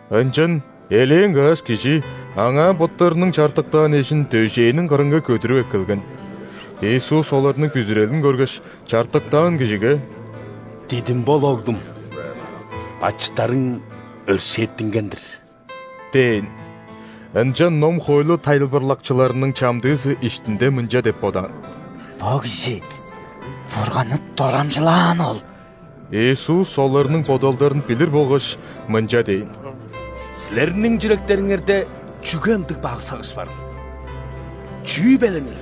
Ынчан элээн каш кижи Аңаа боттарының чартыктаан эжин дөжээниң кырынга көдүрүп эккелген. Иисус оларның бүзүрелин көргеш, чартыктаан кижиге: «Дидим бол, оглум! Бачыттарың өршээттинген-дир» – дээн. Ынчан ном-хоойлу тайылбырлакчыларының чамдыызы иштинде мынча деп бодаан: «Бо кижи Бурганны дорамчылааны ол!» Иисус оларның бодалдарын билир болгаш, мынча дээн: «Силерниң чүректериңерде чүге ындыг бак сагыш барыл? Чүү беленил?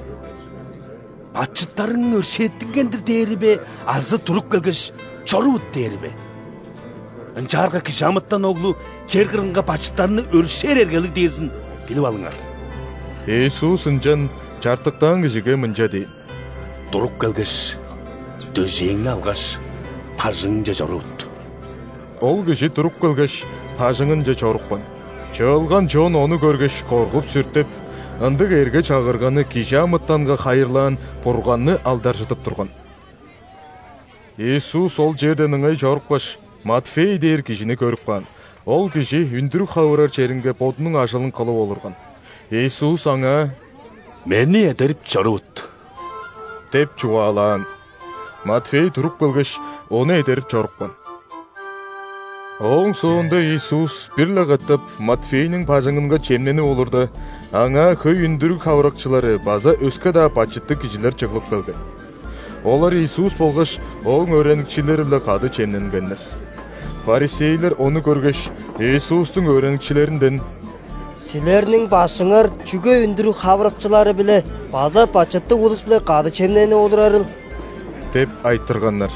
„Бачыттарың өршээттинген-дир“ – дээри бе азы: „Туруп келгеш, чорувут“ – дээри бе? Ынчаарга ·Кижи амытан Оглу чер кырынга бачыттарны өршээр эргелиг дээрзин билип алыңар...» – Иисус ынчан чартыктаан кижиге мынча дээн: «Туруп келгеш, дөжээңни алгаш, бажыңыңче чорувут». Ол кижи туруп келгеш, бажыңынче чорупкан. Чыылган чон ону көргеш, коргуп-сүртеп, ындыг эрге-чагырганы кижи амытанга хайырлаан Бурганны алдаржыдып турган. Иисус ол черден ыңай чорупкаш, Матфей дээр кижини көрүп каан. Ол кижи үндүрүг хавырар черинге бодунуң ажылын кылып олурган. Иисус аңаа: «Мени эдерип чорувут» – деп чугаалаан. Матфей туруп келгеш, Ону эдерип чорупкан. Ооң соонда Иисус бир-ле катап Матфейниң бажыңынга чемненип олурда, аңаа хөй үндүрүг хавырыкчылары база өске-даа бачыттыг кижилер чыглып келген. Олар Иисус болгаш Ооң өөреникчилери-биле кады чемненгеннер. ·Фарисейлер ону көргеш, Иисустуң өөреникчилеринден: «Силерниң Башкыңар чүге үндүрүг хавырыкчылары-биле база бачыттыг улус-биле кады чемненип олурарыл?» – деп айтырганнар.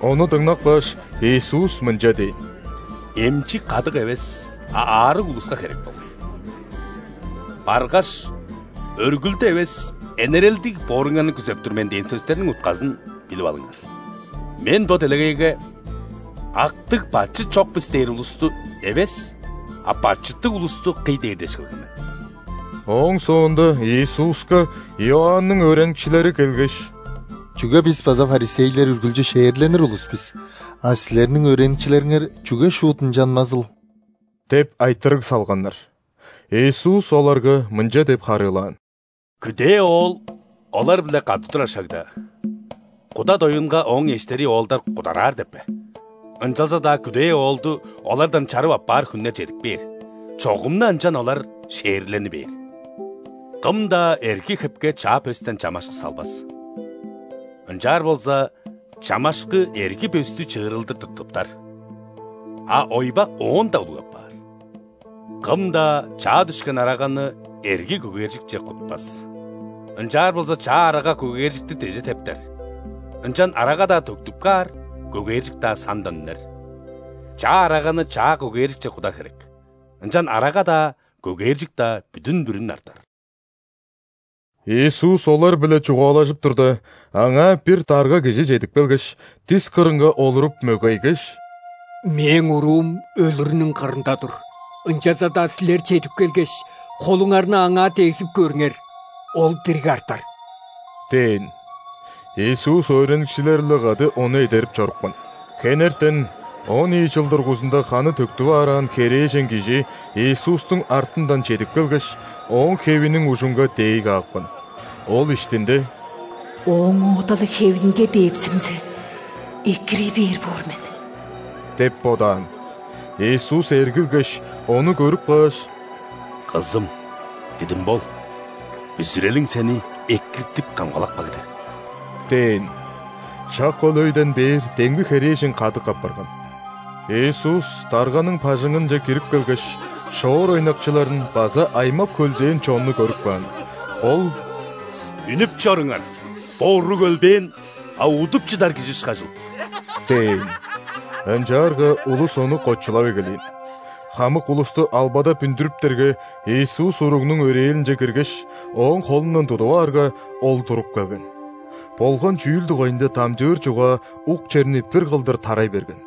Ону дыңнап кааш, Иисус мынча дээн: «Эмчи кадык эвес, а аарыг улуска херек болгай. Баргаш: „Өргүлдү эвес, энерелдиг бооруңарны күзеп тур мен“ – дээн сөстерниң утказын билип алыңар. Мен бо делегейге „Актыг, бачыт чок бис“ дээр улусту эвес, а бачыттыг улусту кый дээр дээш келген мен!» Ооң соонда Иисуска Иоанның өөреникчилери келгеш: «Чүге бис база ·фарисейлер үргүлчү ·шээрленир улус бис, а Силерниң өөреникчилериңер чүге шуут ынчанмазыл?» – деп айтырыг салганнар. Иисус оларга мынча деп харыылаан: «Күдээ оол олар-биле кады турар шагда, куда доюнга ооң эштери оолдар кудараар деп бе? Ынчалза-даа күдээ оолду олардан чарып аппаар хүннер чедип кээр, чогум-на ынчан олар шээрлени бээр. Кым-даа эрги хепке чаа пөстен чамашкы салбас, ынчаар болза, чамашкы эрги пөстү чыырылдыр тыртыптар, а ойбак оон-даа улуг апаар. Кым-даа чаа дүшкен араганы эрги көгээржикче кутпас. Ынчаар болза, чаа арага көгээржикти деже тептер, ынчан арага-даа төктүп каар, көгээржик-даа сандан үнер. Чаа араганы чаа көгээржикче кудар херек, ынчан арага-даа, көгээржик-даа бүдүн-бүрүн артар». Иисус олар-биле чугаалажып турда, Аңаа бир дарга кижи чедип келгеш, дис кырынга олуруп, мөгейгеш: «Мээң уруум өлүрүнүң кырында тур, ынчалза-даа Силер чедип келгеш, холуңарны аңаа дегзип көрүңер – ол дириг артар» – дээн. Иисус өөреникчилери-биле кады ону эдерип чорупкан. Хенертен он ийи чыл дургузунда ханы төктүп аараан херээжен кижи Иисустуң артындан чедип келгеш, Ооң хевиниң ужунга дээй каапкан. Ол иштинде: «Ооң оода-ла хевинге дээпсимзе, экирий бээр боор мен» – деп бодаан. Иисус эргилгеш, ону көрүп кааш: «Кызым, дидим бол! Бүзүрелиң сени экиртип-камгалап кагды» – дээн. Шак ол өйден бээр демги херээжен кадык апарган. Иисус дарганың бажыңынче кирип келгеш, шоор ойнакчыларын база аймап-хөлзээн чонну көрүп каан. Ол: «Үнүп чоруңар! Бо уруг өлбээн, а удуп чыдар кижи ышкажыл» – дээн. Ынчаарга улус Ону кочулап эгелээн. Хамык улусту албадап үндүрүптерге, Иисус уругнуң өрээлинче киргеш, ооң холундан тудуп аарга, ол туруп келген. Болган чүүл дугайында дамчыыр чугаа ук черни бир кылдыр тарай берген.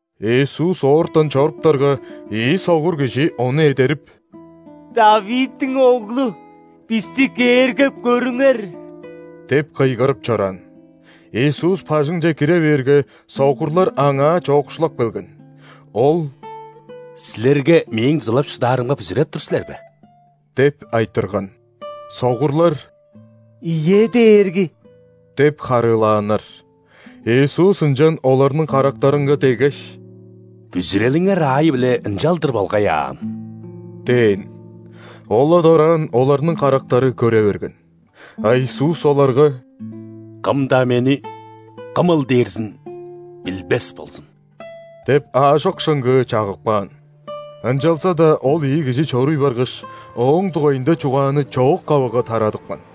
Иисус оортан чоруптарга, ийи согур кижи Ону эдерип: «·Давидтиң Оглу, бисти кээргеп көрүңер!» – деп кыйгырып чораан. Иисус бажыңче кире бээрге, согурлар Аңаа чоокшулап келген. Ол: «Силерге Мээң дузалап шыдаарымга бүзүреп тур силер бе?» – деп айтырган. Согурлар: «Ийе, Дээрги!» – деп харыылааннар. Иисус ынчан оларның карактарынга деггеш: «Бүзүрелиңер аайы-биле ынчалдыр болгай аан» – дээн. Ол-ла дораан оларның карактары көре берген. А Иисус оларга: «Кым-даа Мени кымыл дээрзин билбес болзун» – деп аажок шыңгыы чагып каан. Ынчалза-даа ол ийи кижи чоруй баргаш, Ооң дугайында чугааны чоок-кавыга тарадыпкан.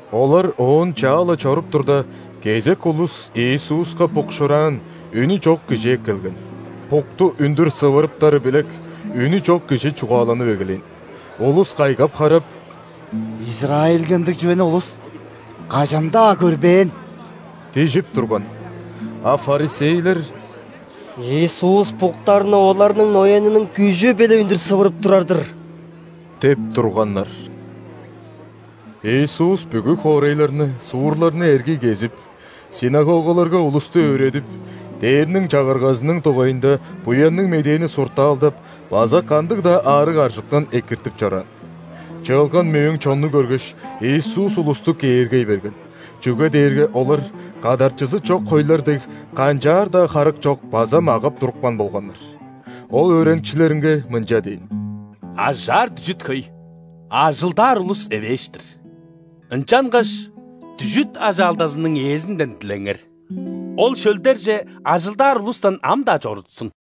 Олар оон чаа-ла чоруп турда, кезек улус Иисуска букшуураан, үнү чок кижи эккелген. Букту үндүр сывырыптары билек, үнү чок кижи чугааланып эгелээн. Улус кайгап-харап: «Израильге ындыг чүвени улус кажан-даа көрбээн!» – дижип турган. А ·фарисейлер: «Иисус буктарны оларның ноянының күжү-биле үндүр сывырып турар-дыр» – деп турганнар. Иисус бүгү хоорайларны, суурларны эргий кезип, ·синагогаларга улусту өөредип, Дээрниң Чагыргазының дугайында Буянныг Медээни суртаалдап база кандыг-даа аарыг-аржыктан экиртип чораан. Чыылган мөөң чонну көргеш, Иисус улусту кээргей берген, чүге дээрге олар, кадарчызы чок хойлар дег, канчаар-даа харык чок база могап-турупкан болганнар. Ол өөреникчилеринге мынча дээн: «Ажаар дүжүт хөй, а ажылдаар улус эвээш-тир. Ынчангаш дүжүт ажаалдазының Ээзинден дилеңер: Ол шөлдерже ажылдаар улустан ам-даа чорутсун».